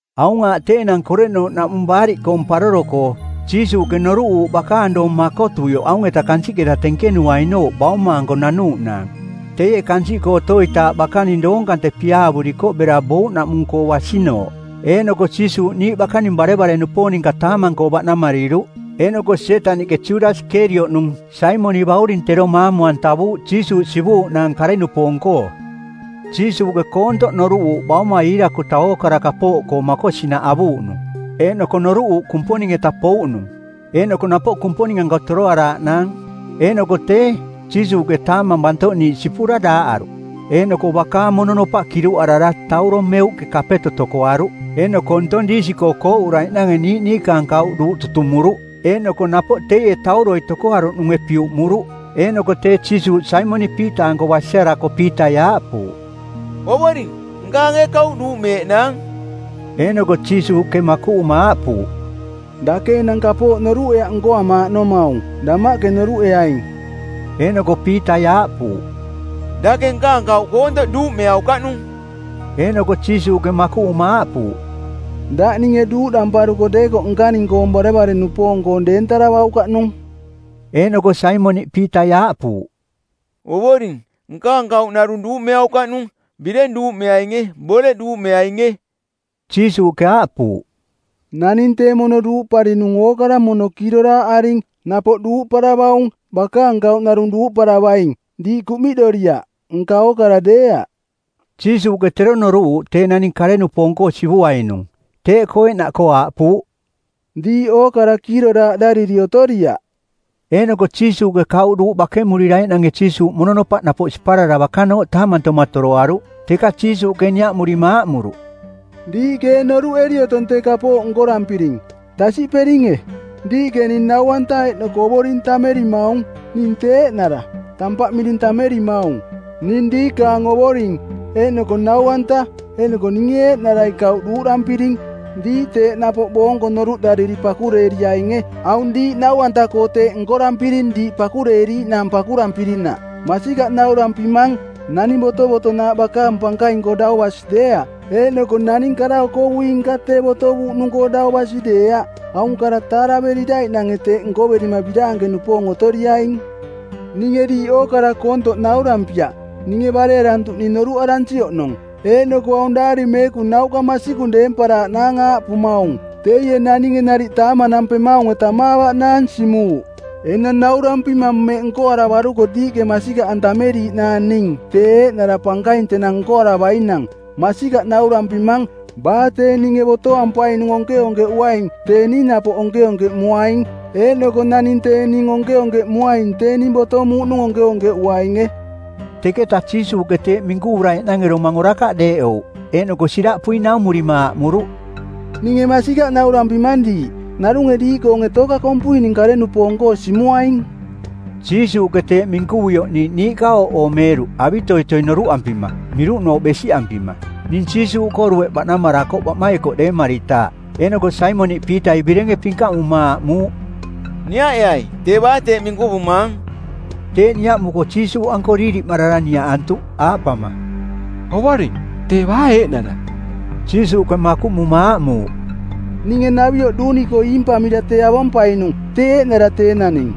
Aung aaꞌ tee enang koreꞌnooꞌnaꞌmung Baariꞌkoong˜ Paroro-koo. Jiisuuꞌke noruꞌuuꞌ bakaang doong makotuioꞌ aung-eta kansiꞌketa tenkenuainooꞌ Bauma-anko nanuuꞌnaang. Teie kansiꞌkoo otoitaaꞌ bakaning doong kante piaavurikoꞌ bera bouꞌnaꞌmung-koo basinooꞌ. Eeꞌnoko Jiisuuꞌ niiꞌ bakaning barevare-nupoong ninka taamang-koo baꞌnamariruꞌ. Eeꞌnoko Sietaniꞌke Judasi Kerioꞌnung, Saimoniꞌ bauring, tero maamu-antavuuꞌ Jiisuuꞌ sivuuꞌnaang kare-nupoong-koo. Jiisuuꞌke koontoꞌ noruꞌuuꞌ Baumai iirakuta ookara kapooꞌkoo makosinaꞌ avuuꞌnung, eeꞌnoko noruꞌuuꞌ Kumponing-eta pouꞌnung, eeꞌnoko napoꞌ Kumponing-anko toroaraaꞌnaang. Eeꞌnoko tee, Jiisuuꞌke taamang bantoꞌniiꞌ sipura daaꞌaruꞌ, eeꞌnoko bakaang mononopaꞌ kiruꞌarara tauro meuꞌke kapeto tokoaruꞌ. Eeꞌnoko ntong diisi-koo kooꞌuraiꞌnange niiꞌ niikaang kauꞌ duuꞌ tutumuruꞌ. Eeꞌnoko napoꞌ teie tauroi tokoaruꞌnunge piuꞌmuruꞌ. Eeꞌnoko tee Jiisuuꞌ Saimoniꞌ Piita-anko basiarako Piitai aaꞌpuuꞌ, “Ovoring, nkaang ee kauꞌ duuꞌmeeꞌnaang?” Eeꞌnoko Jiisuuꞌke makuꞌuma aaꞌpuuꞌ, “Dake enang kapooꞌ noruꞌeaꞌ nkoamaaꞌnomaung. Damaꞌke noruꞌeaing.” Eeꞌnoko Piitai aaꞌpuuꞌ, “Dake nkaang kauꞌ koontoꞌ duuꞌmeaukaꞌnung.” Eeꞌnoko Jiisuuꞌke makuꞌuma aaꞌpuuꞌ, “Daꞌ ninge duuꞌdamparuko deekoꞌ nkaning-koong barevare-nupoong-koong deentaravaukaꞌnung.” Eeꞌnoko Saimoniꞌ Piitai aaꞌpuuꞌ, “Ovoring, nkaang kauꞌ narung duuꞌmeaukaꞌnung, bireng duuꞌmeainge; boreꞌ duuꞌmeainge.” Jiisuuꞌke aaꞌpuuꞌ, “Naning tee mono duuꞌparinung ookara mono kiiroraaꞌaring. Napoꞌ duuꞌparavaung. Bakaang kauꞌ narung duuꞌparavaing. Diiꞌ kuꞌmiꞌdoriaꞌ, nka ookara deeaꞌ.” Jiisuuꞌke tero noruꞌuuꞌ tee naning kare-nupoong-koo sivuainung. Teeꞌkoo eeꞌnaꞌkoo aaꞌpuuꞌ, “Diiꞌ ookara kiiroraaꞌdariri otoriaꞌ.” Eeꞌnoko Jiisuuꞌke kauꞌ duuꞌ bakemuriraiꞌnange Jiisuuꞌ mononopaꞌ napoꞌ siparara bakanooꞌ taamantoma toroaruꞌ. Teka Jiisuuꞌke niaꞌmurima aaꞌmuruꞌ, “Diiꞌke ee noruꞌeri otong tee kapooꞌ nkorampiring? Tasiꞌperinge? Diiꞌke ning Nau-anta eeꞌnoko Ovoring tammerimaung. Ning tee eeꞌnara. Tampaꞌ miring tammerimaung. Ning diikaang Ovoring, eeꞌnoko Nau-anta eeꞌnoko ninge eeꞌnarai kauꞌ duuꞌdampiring. Diiꞌ teeꞌ napoꞌ boonko noruꞌdariri pakureeriainge. Aung diiꞌ nau-anta-koo teeꞌ nkorampiring diiꞌ pakureeriiꞌnaang pakurampirinaꞌ. Masikaꞌ naurampimang, naning botovotonaaꞌ bakaang pankaing-koo dau basi deeaꞌ, eeꞌnoko naning kara-okovui-nka tee botovuuꞌnung-koo dau basi deeaꞌ. Aung kara taaraveriraiꞌnange teeꞌ nkoverima biraanke-nupoong otoriaing. “Ninge diiꞌ ookara koontoꞌ naurampiaꞌ. Ninge barearantuꞌning noruꞌaransi oꞌnong. Eeꞌnoko aung Daari Meekung nauꞌka masikung deemparaaꞌnaang aaꞌpumaung, ‘Teie naninge nariꞌ taamanampemaunge tamaavaꞌnaang simuuꞌ.’ Enang naurampimang mmeꞌ nkoaravaruko diiꞌke masikaꞌantameriiꞌnaang ning tee eeꞌnara pankaing tenang nkoaravainang. Masikaꞌ naurampimang, baa tee ninge botoampainung onkeonkeꞌuaing tee ning napoꞌ onkeonkeꞌmuaing. Eeꞌnoko naning tee ning onkeonkeꞌmuaing tee ning botomuuꞌnung onkeonkeꞌuainge.” Teketa Jiisuuꞌke teeꞌ minkuvuraiꞌnange domang orakaꞌ deeꞌouꞌ, eeꞌnoko siraꞌpui naumurima aaꞌmuruꞌ, “Ninge masikaꞌ naurampimang diiꞌ, narunge diiꞌkoonge tooka kompui ning kare-nupoong-koo simuaing.” Jiisuuꞌke teeꞌ minkuvuioꞌ niiꞌ niiꞌka ooꞌoomeeruꞌ avitoitoi noruꞌampima, miruꞌnooꞌ besiꞌampima. Ning˜ Jiisuuꞌkoo dueꞌ baꞌnamarakoꞌ baꞌmaikoꞌ deemaritaaꞌ. Eeꞌnoko Saimoniꞌ Piitai birenge pinkaꞌmuma aaꞌmuuꞌ, “Niaꞌeai tee baa teeꞌ minkuvumaang.” Teeꞌ niaꞌmuko Jiisuuꞌanko diiriꞌmarara niaꞌantuꞌ, aaꞌpama, “Ovoring, tee baa eeꞌnara?” Jiisuuꞌke makuꞌmuma aaꞌmuuꞌ, “Ninge navioꞌ duuni-koo iimpamira tee avompainung, tee eeꞌnara tee naning.”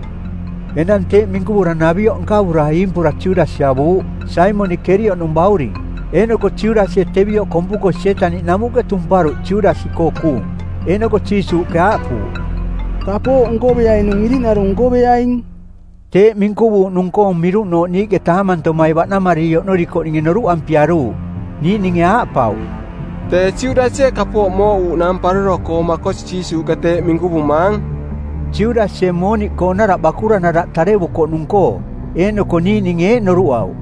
Enang teeꞌ minkuvura navioꞌ nkavura iimpura Judasi avuuꞌ, Saimoniꞌ Kerioꞌnung bauring. Eeꞌnoko Judasie tevioꞌ kompuko Sietaniꞌ namuꞌke tumparuꞌ Judasi-koo kuung. Eeꞌnoko Jiisuuꞌke aaꞌpuuꞌ, “Kapooꞌ nkoveainung iriꞌnarung nkoveaing.” Teeꞌ minkuvuuꞌnung-koong miruꞌnooꞌ niiꞌke taamantomai baꞌnamariri oꞌnorikoꞌninge noruꞌampiaruuꞌ. Niiꞌninge aaꞌpauꞌ, “Tee Judasie kapooꞌ mooꞌuuꞌnaang paroro-koo makosi Jiisuuꞌke teeꞌ minkuvumaang,” Judasie mooniꞌkoonaraꞌ bakura-naraꞌ tarevukoꞌnung-koo. Eeꞌnoko niiꞌninge eeꞌ noruꞌauꞌ,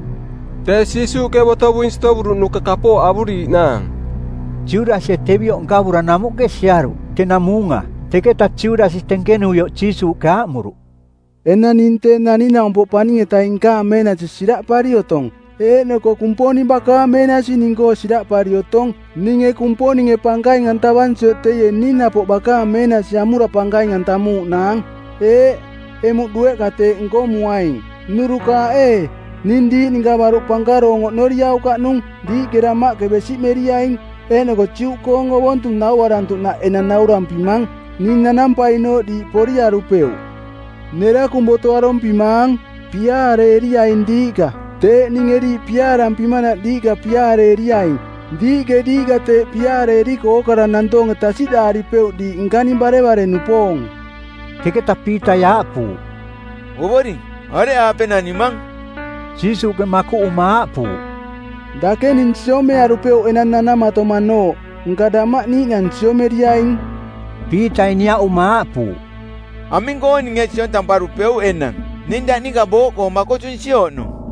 “Tee Jiisuuꞌke botovuing sitovuruꞌnuka kapooꞌ avuriiꞌnaang.” Judasie tevioꞌ nkavura namuꞌke siaruꞌ, tenang muunga. Teketa Judasi tenkenuioꞌ Jiisuuꞌke aaꞌmuruꞌ, “Enang ning Tee Naning-naumpoꞌ Paning-etaing nkaang meenasi siraꞌpari otong, eeꞌnoko Kumponing bakaang meenasi ning-koo siraꞌpari otong. Ninge Kumponinge pankaing-antavansioꞌ teie ning napoꞌ bakaang meenasi amura pankaing-antamuuꞌnaang. Eeꞌ, emuꞌ dueꞌka teeꞌ nkomuaing. Nnurukaaꞌ ee, ning diiꞌ ninka baruꞌ pankaroong oꞌnoriaukaꞌnung. Diiꞌke damaꞌke besiꞌmeriaing, eeꞌnoko Juꞌkoong ovontung nauarantuꞌnaꞌ enang naurampimang, ning nanampainooꞌ diiꞌ poriarupeuꞌ. Nerakung boto arompimaang: Piaareeriaing diiꞌka. Teeꞌ ninge diiꞌ piaarampimanaꞌ diiꞌka piaareeriaing. Diiꞌke diiꞌka teeꞌ piaareeriko ookara nantoonge tasiꞌdaaripeuꞌ diiꞌ nkaning barevare-nupoong.” Teketa Piitai aaꞌpuuꞌ, “Ovoring, areꞌaape nanimang?” Jiisuuꞌke makuꞌuma aaꞌpuuꞌ, “Dake ning siomearupeuꞌ enang nanamatomanooꞌ, nka damaꞌ niiꞌnang siomeriaing.” Piitai niaꞌuma aaꞌpuuꞌ, “Aming-koo ninge siontamparupeuꞌ enang? Ning daꞌ ninka booꞌkoo makotunsi oꞌnong.”